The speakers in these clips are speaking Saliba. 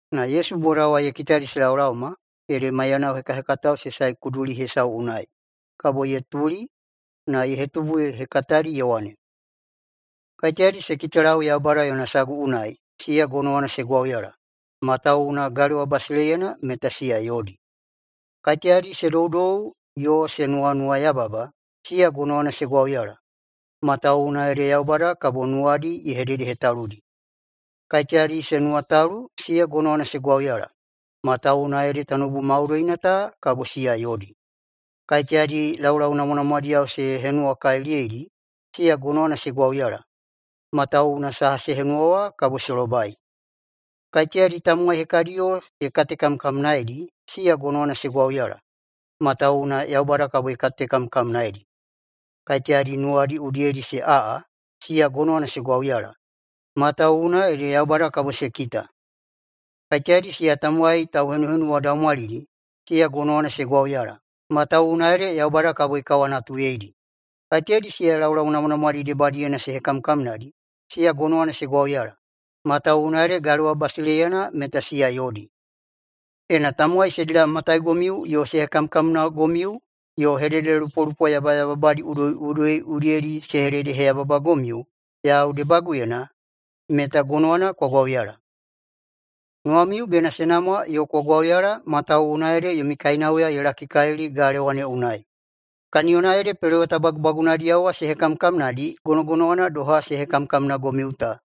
Na Yesu boda wa ye kitadi se laolaoma, ede maiyanao hekahekatao se sae kuduli hesau unai. Kabo ye tuli na ye hetubu ye hekatadi ye wane, “Kaiteyadi se kitalau Yaubada yona sagu unai, siya gonowana se gwauyala, matawuwuna galewa basileiyana meta siya yodi. Kaiteyadi se doudou yo se nuwanuwayababa, siya gonowana se gwauyala, matawuwuna ede Yaubada kabo nuwadi ye hededehetaludi. Kaiteyadi se nuwatalu, siya gonowana se gwauyala, matawuwuna ede tanoubu maudoina ta kabo siya yodi. Kaiteyadi laulau namwanamwadiyao se henuwakaliliyeidi, siya gonowana se gwauyala, matawuwuna saha se henuwa wa kabo se lobai. Kaiteyadi tamowai hekadiyo se katekamkamnaeidi, siya gonowana se gwauyala, matawuwuna Yaubada kabo ye katekamkamnaeidi. Kaiteyadi nuwadi udiyedi se aꞌa, siya gonowana se gwauyala, matawuwuna ede Yaubada kabo se kita. Kaiteyadi siya tamowai tauhenuhenuwadaumwalidi, siya gonowana se gwauyala, matawuwuna ede Yaubada kabo ye kawanatuyeidi. Kaiteyadi siya laulau namwanamwadi debadiyena se hekamkamnadi, siya gonowana se gwauyala, matawuwuna ede galewa basileiyana meta siya yodi. Ena tamowai se dilamataigomiu yo se hekamkamnagomiu yo hededelupolupo yabayababadi udoiꞌudoi udiyedi se hededeheyababagomiu yau debaguyena, meta gonowana kwa gwauyala. Nuwamiu bena se namwa yo kwa gwauyala matawuwuna ede yomi kainauya ye lakikalili galewa ne unai. Kaniyona ede peloweta bagubagunadiyao wa se hekamkamnadi gonogonowana doha se hekamkamnagomiu ta.”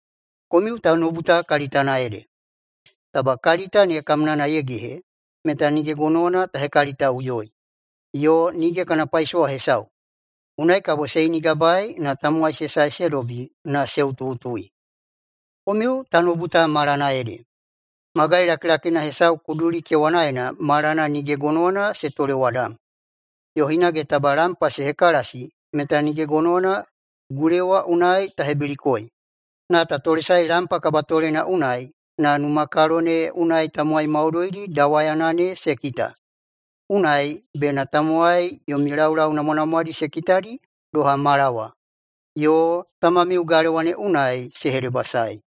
“Komiu tanoubu ta kalitana ede. Taba kalita ne kamnana ye gehe, meta nige gonowana ta hekalitaꞌuyoi, yo nige kana paisowa hesau. Unai kabo se inigabae na tamowai se sae se dobi na se utuꞌutui. Komiu tanoubu ta malana ede. Magai lakilakina hesau kuduli kewanaena malana nige gonowana se tolewadam. Yo hinage taba lampa ta hekalasi, meta nige gonowana gulewa unai ta hebilikoi. Na ta tolesaei lampa kabatolena unai na numakalo ne unai tamowai maudoidi dawayana ne se kita. Unai bena tamowai yomi laulau namwanamwadi se kitadi doha mala wa, yo tamamiu galewa ne unai se hedebasaei.”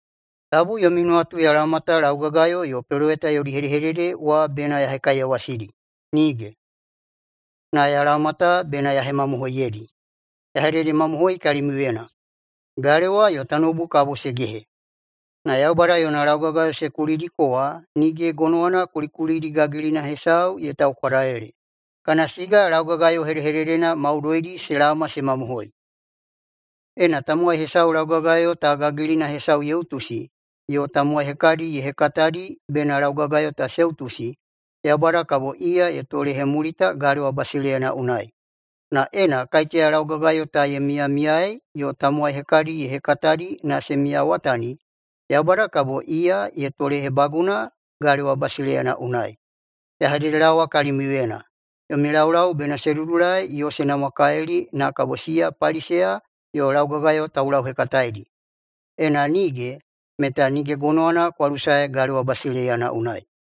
“Tabu yomi nuwatu ya laoma ta laugagayo yo peloweta yodi hedehedede wa bena ya hekaiyawasidi. Nige! Na ya laoma ta bena ya hemamohoiyeidi. Ya hededemamohoi kalimiuyena: Galewa yo tanoubu kabo se gehe, na [Yaubada yona] laugagayo [se kulidiko] wa nige gonowana kulikulidi gagilina hesau ye taukwadalele, kana siga laugagayo hedehededena maudoidi se laoma se mamohoi. Ena tamowai hesau laugagayo ta gagilina hesau ye utusi yo tamowai hekadi ye hekatadi bena laugagayo ta se utusi, Yaubada kabo iya ye tolehemulita galewa basileiyana unai. Na ena kaiteya laugagayo ta ye miyamiyaei yo tamowai hekadi ye hekatadi na se miyawatani, Yaubada kabo iya ye tolehebaguna galewa basileiyana unai. Ya hededelaowa kalimiuyena: Yomi laulau bena se dudulai yo se namwakalili na kabo siya Paliseya yo laugagayo taulauhekataedi. Ena nige, meta nige gonowana kwa lusae galewa basileiyana unai.”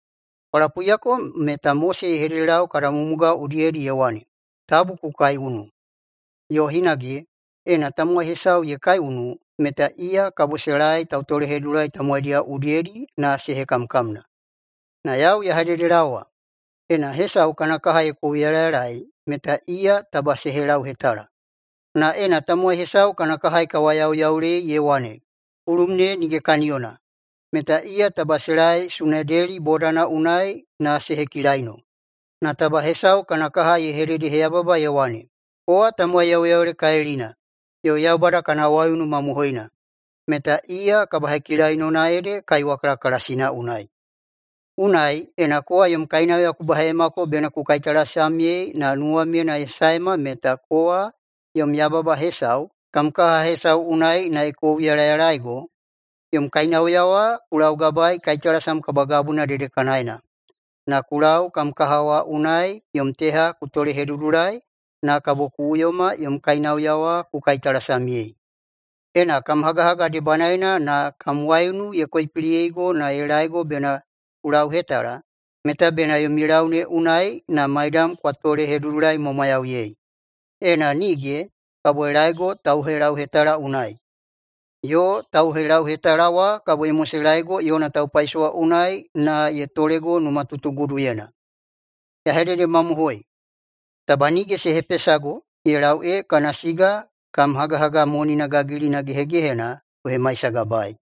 “Kwa lapuiyako meta Mose ye hededelau kada mumugao udiyedi ye wane, ‘Tabu ku kaiunu’, yo hinage, ‘Ena tamowai hesau ye kaiunu meta iya kabo se laei tautolehedudulai tamowaidiyao udiyedi na se hekamkamna.’ Na yau ya hededelaowa, ena hesau kana kaha ye kouyalayalaei meta iya taba se helauhetala. Na ena tamowai hesau kana kaha ye kawayauyaulei ye wane, ‘Kulum ne nige kaniyona!’, meta iya taba se laei Sunedeli bodana unai na se hekilaino. Na taba hesau kana kaha ye hededeheyababa ye wane, ‘Kowa tamowai yauyaulekalilina, yo Yaubada kana waiunu mamohoi!’, meta iya kabahekilainona ede kaiwa kalakalasina unai. Unai, ena kowa yom kainauya ku baheiyamako bena ku kaitalasamyei na nuwamyena ye saema meta [kowa yom yababa hesau] kam kaha hesau unai na ye kouyalayalaego, yom kainauya wa ku laugabaei kaitalasam kabagabuna dedekanaena, na ku lau kam kaha wa unai yom teha ku tolehedudulai na kabo ku uyoma yom kainauya wa ku kaitalasamyei. Ena [kam hagahaga debanaena na] kam waiunu ye koipiliyeigo na ye laego bena ku lauhetala, meta bena yomi lau ne unai na maidam kwa tolehedudulaimwamwayauyei. Ena nige, kabo ye laego tauhelauhetala unai. Yo tauhelauhetala wa kabo ye moselaego yona taupaisowa unai na ye tolego numatutuguduyena. Ya hededemamohoi: Taba nige se hepesago ye lau ee kana siga kam hagahaga monina gagilina gehegehena ku hemaisagabaei.”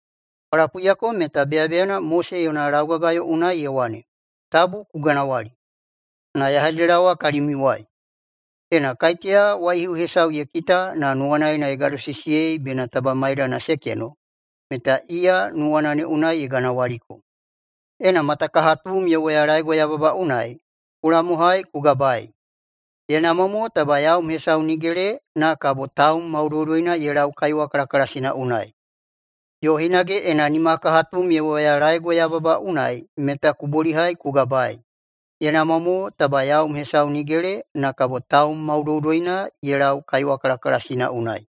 “Kwa lapuiyako meta beyabeyana Mose yona laugagayo unai ye wane, ‘Tabu ku ganawali.’ Na ya hededelaowa kalimiuwai: Ena kaiteya waihiu hesau ye kita na nuwanaena ye gadosisiyei bena taba maidana se keno, meta iya nuwana ne unai ye ganawaliko. Ena matakahatum ye woyalaego yababa unai, ku lamohai na ku gabaei. Ye namwa mo taba yaum hesau nigele na kabo taum maudoudoina ye lau kaiwa kalakalasina unai. Yo hinage ena nimakahatum ye woyalaego yababa unai meta ku bolihai ku gabaei. Ye namwa mo taba yaum hesau nigele na kabo taum maudoudoina ye lau kaiwa kalakalasina unai.”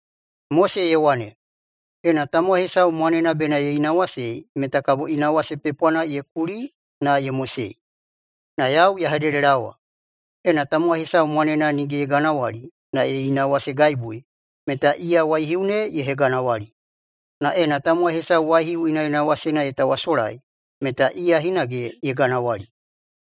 “Mose ye wane, ‘Ena tamowai hesau mwanena bena ye inawasei meta kabo inawase pepwana ye kuli na ye mosei.’ Na yau ya hededelaowa: Ena tamowai hesau mwanena nige ye ganawali na ye inawasegaibui, meta iya waihiu ne ye heganawali. Na ena tamowai hesau waihiu inaꞌinawasena ye tawasolai, meta iya hinage ye ganawali.”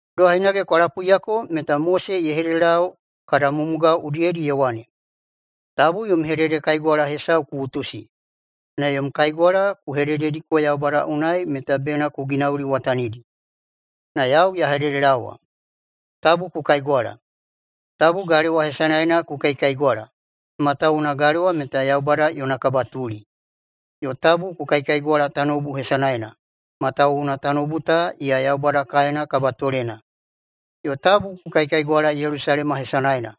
“Doha hinage kwa lapuiyako meta Mose ye hededelau kada mumugao udiyedi ye wane, ‘Tabu yom hededekaigwala hesau ku utusi, na yom kaigwala ku hededediko Yaubada unai meta bena ku ginauliwatanidi.’ Na yau ya hededelaowa: Tabu ku kaigwala! Tabu galewa hesanaena ku kaikaigwala, matawuwuna galewa meta Yaubada yona kabatuli. Yo tabu ku kaikaigwala tanoubu hesanaena, matawuwuna tanoubu ta iya Yaubada kaena kabatolena. Yo tabu ku kaikaigwala Yelusalema hesanaena,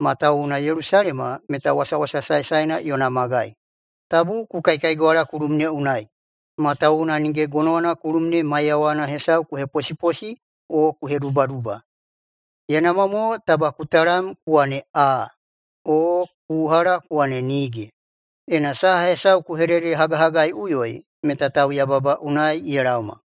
matawuwuna Yelusalema meta wasawasa saesaena yona magai. Tabu ku kaikaigwala kulum ne unai, matawuwuna nige gonowana kulum ne maiyawana hesau ku heposiposi o ku hedubaduba. Ye namwa mo taba ku talam ku wane ‘Aa’, o ku uhala ku wane ‘Nige’. Ena saha hesau ku hededehagahagaiꞌuyoi meta tauyababa unai ye laoma.”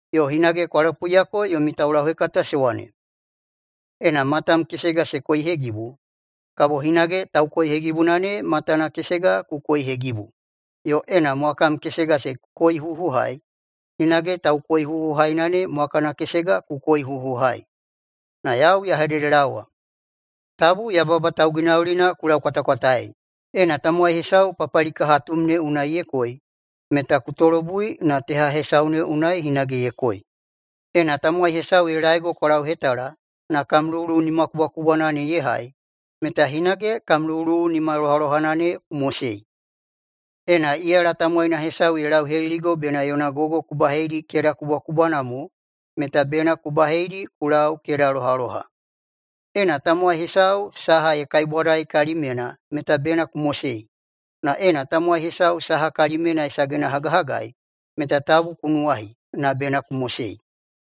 “Yo hinage kwa lapuiyako yomi taulauhekata se wane, ‘Ena matam kesega se koihegibu, kabo hinage taukoihegibuna ne matana kesega ku koihegibu, yo ena mwakam kesega se koihuhuhai hinage taukoihuhuhaina ne mwakana kesega ku koihuhuhai.’ Na yau ya hededelaowa: Tabu yababa tauginaulina ku laukwatakwataei. Ena tamowai hesau papalikahatum ne unai ye koi meta ku tolobui na teha hesau ne unai hinage ye koi. Ena tamowai hesau ye laego kwa lauhetala na kam luwuluwu nimakubwakubwana ne ye hai meta hinage kam luwuluwu nimalohalohana ku mosei. Ena iyala tamowaina hesau ye lauheliligo bena yona gogo ku baheidi keda kubwakubwana mo, meta bena ku baheidi ku lau kedalohaloha. Ena tamowai hesau saha ye kaibwadai kalimyena meta bena ku mosei. Na ena tamowai hesau saha kalimyena ye sagenahagahagai meta tabu ku nuwahi, na bena ku mosei.”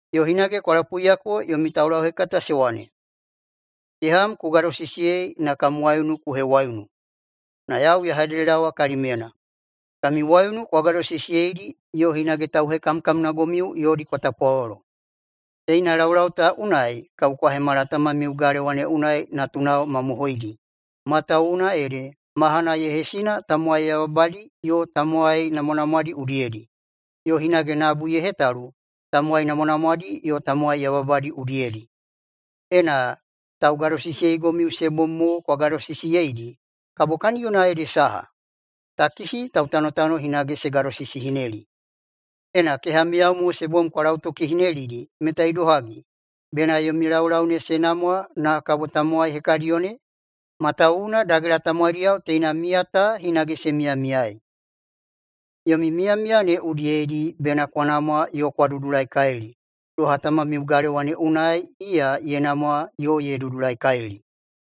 “Yo hinage kwa lapuiyako yomi taulauhekata se wane, ‘Keham ku gadosisiyei na kam waiunu ku hewaiunu.’ Na yau ya hededelaowa kalimiuyena: Kami waiunu kwa gadosisiyeidi yo hinage tauhekamkamnagomiu yodi kwa tapwalolo. Teina laulau ta unai kabo kwa hemala tamamiu galewa ne unai natunao mamohoidi, matawuwuna ede mahana ye hesina tamowai yabayababadi yo tamowai namwanamwadi udiyedi, yo hinage nabu ye hetalu tamowai namwanamwadi yo tamowai yabayababadi udiyedi. Ena taugadosisiyeigomiu se bom mo kwa gadosisiyeidi, kabo kaniyona ede saha? Takisi tautanotano hinage se gadogadosisihineli. Ena kehamiyao mo se bom kwa lautokihinelidi meta idohagi, bena yomi laulau ne se namwa na kabo tamowai hekadiyo ne? Matawuwuna dagela tamowaidiyao teina miya ta hinage se miyamiyaei. Yomi miyamiya ne udiyedi bena kwa namwa yo kwa dudulaikalili, doha tamamiu galewa ne unai iya ye namwa yo ye dudulaikalili.”